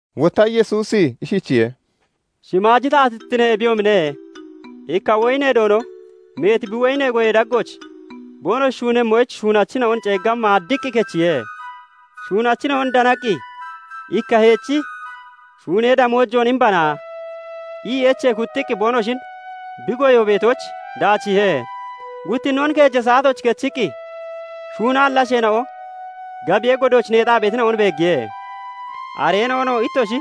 Wotta Yesuusi ishichiye:- "Shimaaji taatittine ebiyoomine; ikka woyinee Doono meeti bi woyinee goyee daggooch boonoshi shuunemmoyich shuunachina'on ceegga maaddiqqi kechiye. Shuunachina'on danaqqi, 'Ikka heechi shuunee damoojoon imbana' ii echee kuxxiqqi boonoshin bi goyo beetooch daachiihe. "Guttinoon keeja saatooch kechiqqi shuunaalli asheena'o gabiyee godooch neexaa beetina'on beeggiye; Areena'onoo 'Ittoshi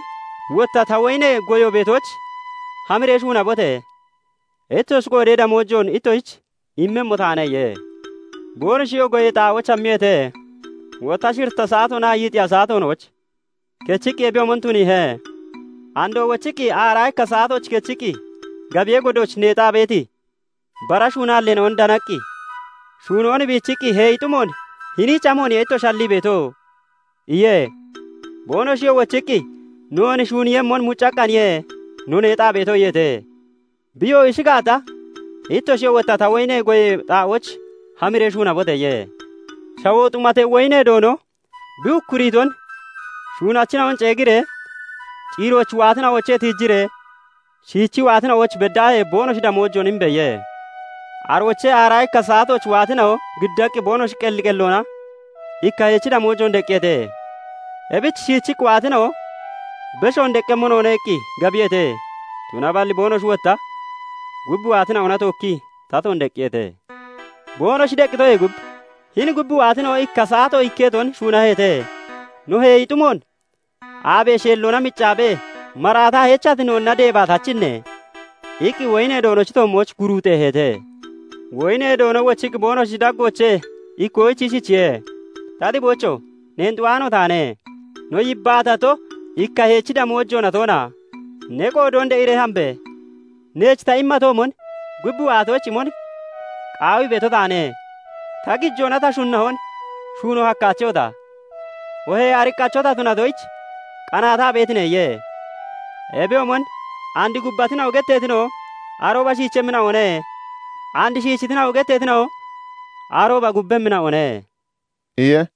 wotta ta woyinee goyo beetooch hamiree shuunabote! Ittoshi qoodee damoojoon ittoshich immemmo taane' iye. Boonoshiyoo goyee xaa'ooch hammiyeete. "Wotta shiritta saatoonaa yiixiya saatoonooch kechiqqi ebiyoomon tuniihe. Andoo wochiqqi aaraa ikka saatooch kechiqqi gabiyee godooch neexaa beeti bara shuunaalleena'on danaqqi, 'Shuunoon biichiqqi heeyi xumoon hiniich amooniye ittoshi hallii beeto?' iye. "Boonoshiyoo wochiqqi, 'Noon shuuniiyemmon muccaqqaaniye no neexaa beeto' iyeete. "Biyoo 'Ishi gaata, ittoshiyoo wotta ta woyinee goyee xaa'ooch hamiree shuunabote!' iye. "Shawoo xumatee woyinee doono bi ukkuriiton 'Shuunachina'on ceegiree ciirooch waatina'oochee tiijiree shiichii waatina'ooch beddaahee boonoshi damoojoon imbe!' iye. "Aroochee aaraa ikka saatooch waatina'o giddaqqi boonoshi qelli qelloona ikka heechi damoojoon deqqiyeete. Ebich shiichii waatina'o 'Beshoon deqqemmo noone' iqqi gabiyeete; tunaballi boonoshi wotta gub waatina'ona tookkii tatoon deqqiyeete. Boonoshi deqqitoyee gub 'Hini gub waatina'o ikka saato ikketon shuunaheete; no heeyi xumoon aabee sheelloona miccaabee maraataa heechati noonna deebaa tachine?' iqqi woyinee doonochi toommooch guruuxeeheete. "Woyinee doono wochiqqi boonoshi daggoochee ikkoyich ishichiye:- 'Ta xiboocho! Neen xu'aano taane. No yibbaatato, ikka heechi damoojoona toona? Ne qoodoon de'iree hambe! Neech ta immatoomon gub waatoyich imon qaawii beeto taane. Ta gijoona ta shunahon shuuno hakkaachehota? Oohee ariqqacho ta tunatoyich qanaataa beetine?' iye. "Ebiyoomon and 'Gubbatina'o' getteetina'o arooba shiichemmina'one; and 'Shiichitina'o' getteetina'o arooba gubbemmina'one" iye.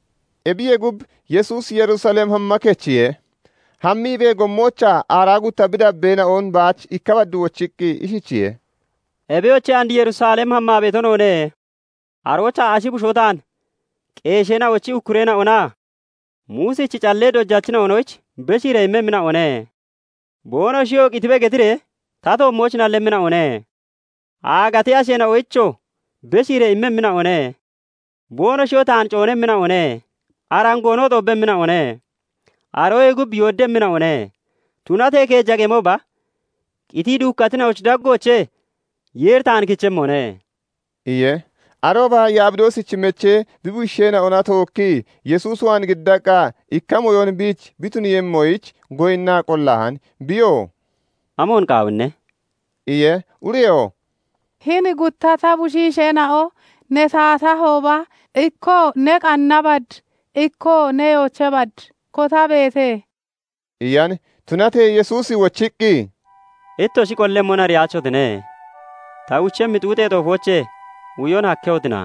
Ebiyee gub, Yesuusi Yerusalem hamma kechiye; hammiibee gommoochaa aaraa gutta bi dabbeena'on baach ikka bad wochiqqi ishichiye:- "Ebiyoche! And Yerusalem hammaa beeto noone. Aroochaa ashi bushoo taan qeesheena'ochi ukkureena'onaa Muusichi callee dojachina'onoyich beshiiree immemmina'one. Boonoshiyoo 'Qitibe' getiree ta toommooch nallemmina'one; Aagatee asheena'oyichoo beshiiree immemmina'one; boonoshiyoo taan coonemmina'one; arangoonoo xoobbemmina'one; aroyee gub yooddemmina'one. Tunatee keeja qemooba qitii duukkatina'ochi daggoochee Yeeri taan kichemmone" iye. Arooba Yabidoosichi mechee bi bushiisheena'ona tookkii Yesuus waan giddaqqa ikka mooyon biich bi tuniiyemmoyich goyinnaa qollahan. Biyoo "Amoon qaawinne?" iye. Ureyoo "Hini gutta ta bushiisheena'o, ne taatahooba ikkoo ne qanna bad, ikkoo ne yoocha bad kotabeete" iyan. Tunatee Yesuusi wochiqqi, "Ittoshi qollemmon ariyaachotine. Ta uchemmi xuuxee xoofoochee uyon hakkehotina?"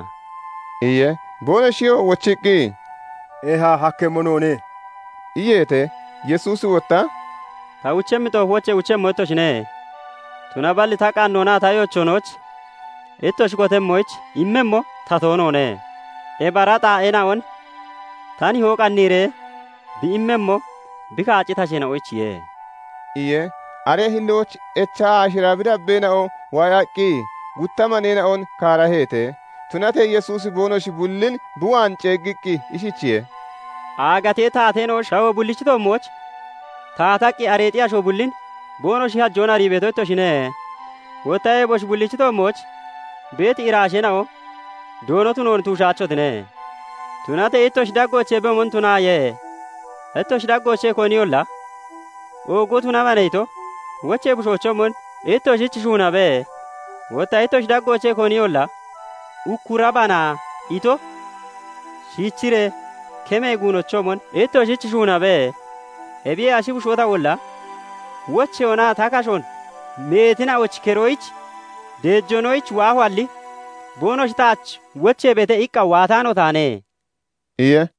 iye. Boonoshiyoo wochiqqi, "Eeha, hakkemmo noone" iyeete. Yesuusi wotta "Ta uchemmi xoofoochee uchemmo ittoshine. Tunaballi ta qannoonaa ta yoochoonooch ittoshi kotemmoyich immemmo ta toonoone. Ebi ara xaa'eena'on ta nihoo qanniiree bi immemmo, bi kaacciti asheena'oyichiye" iye. Aree hillooch echa aashira bi dabbeena'o waayaqqi gutta maneena'on kaaraheete. Tunatee Yesuusi boonoshi bullin bi waan ceeggiqqi ishichiye:- "Aagatee taateena'o shawoo bullichi toommooch taataqqi areexi asho bullin boonoshi hajoon arii beeto ittoshine; wotta eboshi bullichi toommooch beeti iraasheena'o doono tunoon tuushaachotine. Tunatee ittoshi daggooch ebiyoomon tunaaye. Ittoshi daggoochee koniyolla 'Oogo tunabana' ito, wochee bushoochoomon ittoshich shuunabe; Wotta ittoshi daggoochee koniyolla 'Ukkurabana' ito, shiichiree kemee guunochoomon ittoshich shuunabe. Ebiyee ashi bushoo tawolla wocheyoonaa ta kashoon meetina'ochi keroyich deejoonoyich waahoalli, 'Boonoshi taach wocheebeete' iqqa waataano taane" iye.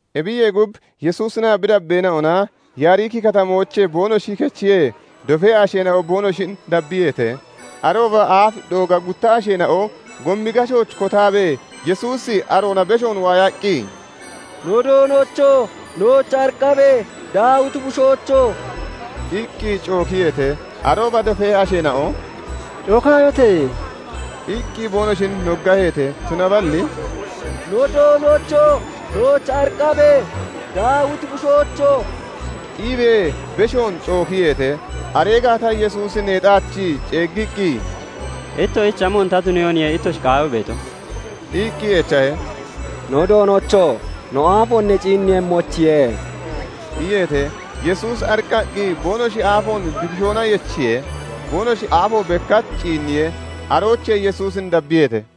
Ebiyee gub, Yesuusinaa bi dabbeena'ona Yaariki katamoochee boonoshi kechiyee, dofee asheena'o boonoshin dabbiyeete. Arooba aaf dooga gutta asheena'o gomi gashooch kotaabee Yesuusi aroona beshoon waayaqqi, "No Doonocho! Nooch ariqqabe! Daawiti bushoocho!" iqqi cookiyeete. Arooba doofee asheena'o "Cookaayote!" iqqi boonoshin noggaheete. Tunaballi "No Doonocho! Nooch ariqqabe! Daawiti bushoocho!" iibee beshoon cookiyeete. Aree gaata Yesuusi neexaachii ceeggiqqi, "Ittoshich amoon ta tuniyooniye ittoshi qaawii beeto?" iqqi echahe. "No Doonocho! No aafoon ne ciinniiyemmoyichiye!" iyeete. Yesuusi ariqqaqqi boonoshi aafoon bi kishoona yechiye. Boonoshi aafo bekkach ciinniye; aroochee Yesuusin dabbiyeete.